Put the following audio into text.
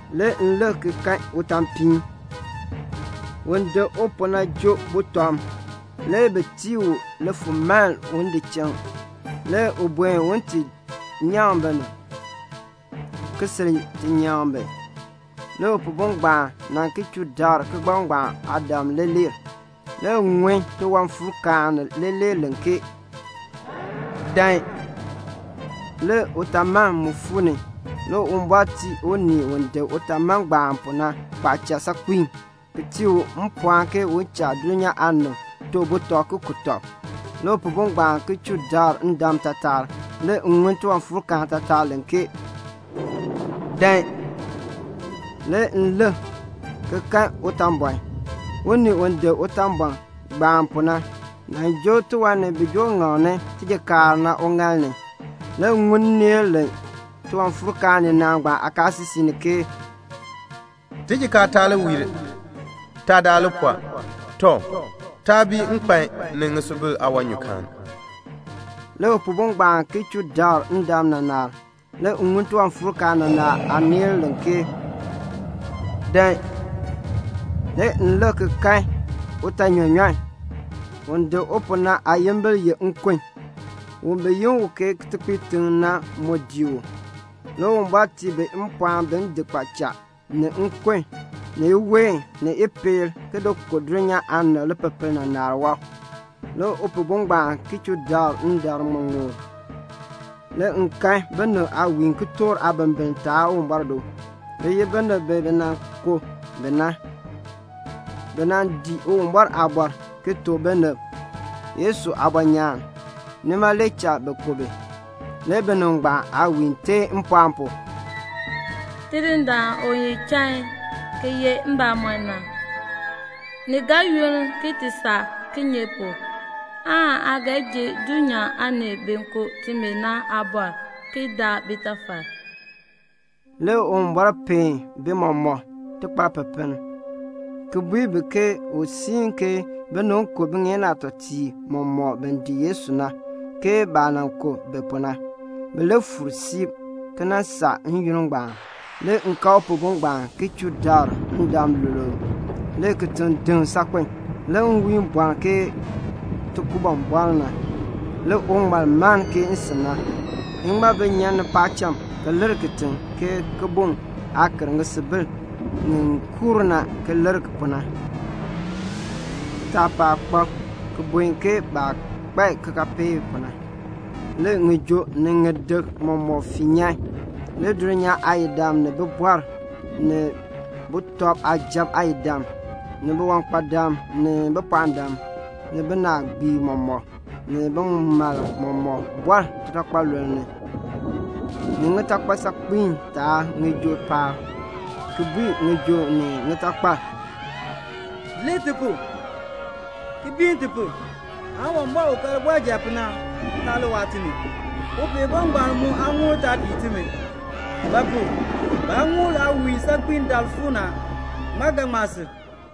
Le m lik ki kan utaapiin. Un dik u pu na joo butɔm. Le bi tii u lifulmaln un di chiŋ. Le u buen un ti nyaŋ binib, ki sil ti nyaŋ bi. Le Upihbo ngbaan nan chuu dabr kigbaŋ aadam leeler. Le m ŋun tiwanfuurkaan leeler len ke "Dan." Le utaaman mu fuu ni. Le Uwumbɔr tii un dik utaaman pu na kpaacha saakpiin, ki tii u mpɔɔn ke u cha dulnyaa aanib to butɔb ki ku tɔb. Le Upihbo ngbaan chuu dabr ndam taatar. Le m ŋun tiwanfuurkaan taatar len ke "Dan." Le m lik ki kan utaanbɔn. Un dik utaanbɔn pu na le joo tiwan ni bi joo ŋaŋni tijikaar na uŋaal ni. Le m ŋun nneel len tiwanfuurkaan ninaa ngbaan aakaasisik ni ke "Tijikaar taa li wiir, taadaak li pɔɔ. Tɔ, taa bii nkpan ni ŋisubil aawanyukaan." Le Upihbo ngbaan chuu dabr ndam naanar. Le m ŋun tiwanfuurkaan naanar aaneel len ke "Dan." Le m lik ki kan utaanyɔnyɔn. Un dik u pu na aayimbil ye Nkun. Un bi yi u Kitekpiitiŋ na mu dii u. Le Uwumbɔr tii bi mpɔɔn bin di kpaacha, ni nkon, ni iween, ni ipeel, ki ku dulnyaa aanib lipepel naanar yaab. Le Upihbo ngbaan chuu dabr ndam ŋmuŋmur. Le m kan binib aawiin kitork aabimbiln taab Uwumbɔr do. Bi ye binib bi bi nan ku bi na. Bi nan dii Uwumbɔr aaliin, ki tuk binib Yesu aabɔnyaan. Nima le cha bi ku bi. Le binib ngbaan aawiin teen mpɔɔn pu, "Tidindaan u ye chain ki ye mbamɔn na, ni ga yunn ki ti saa kinye pu aan aa ga ji dulnyaa aanib bi ku timi na aabɔr ki daa bitafal?" Le Uwumbɔr peen bi mɔmɔk tikparpipiin, ki bui bi ke u siin ke binib ku bitutuŋeen aatɔtiib mɔmɔk bi dii Yesu na, ke baah nan ku bi pu na. Bi li fuur siib ki nan saa n-yoonn ngbaan. Le m kan Upihbo ngbaan chuu dabr ndam luluub. Le kitiŋ deŋ saakpen. Le nwiin bɔln ke tikumbubɔln na. Le uŋmal mann ke nsin na. Iŋmabi nyan ni paacham ki lir kitiŋ ke kibuŋ aah ker ŋisubil ŋi kuur na ki lir pu na. Kitaapaak kpab ki buen ke baah kpai kikaapeek pu na. Le ŋijoo ni ŋiyik mɔmɔk fii nyan. Le dulnyaa aayidam ni bibɔrb ni sujatiib aayidam, ni biwankpadam ni bipɔɔndam, ni binaagbiib mɔmɔk, ni bimalb mɔmɔk, bi bɔr titakpaluln ni, ni ŋitakpal saakpiin taab ŋijoo paab, ki bui ŋijoo ni ŋitakpal, "Lir ti pu, ki biin ti pu, Uwumbɔr u ka libɔrjal pu na taa li waa timi, Upihbo ngbaan aaŋuul taa pii timi; ba pu? baaŋuul aawiin saakpiin daal fuu ni a. Ŋmaa ga ŋma sil?"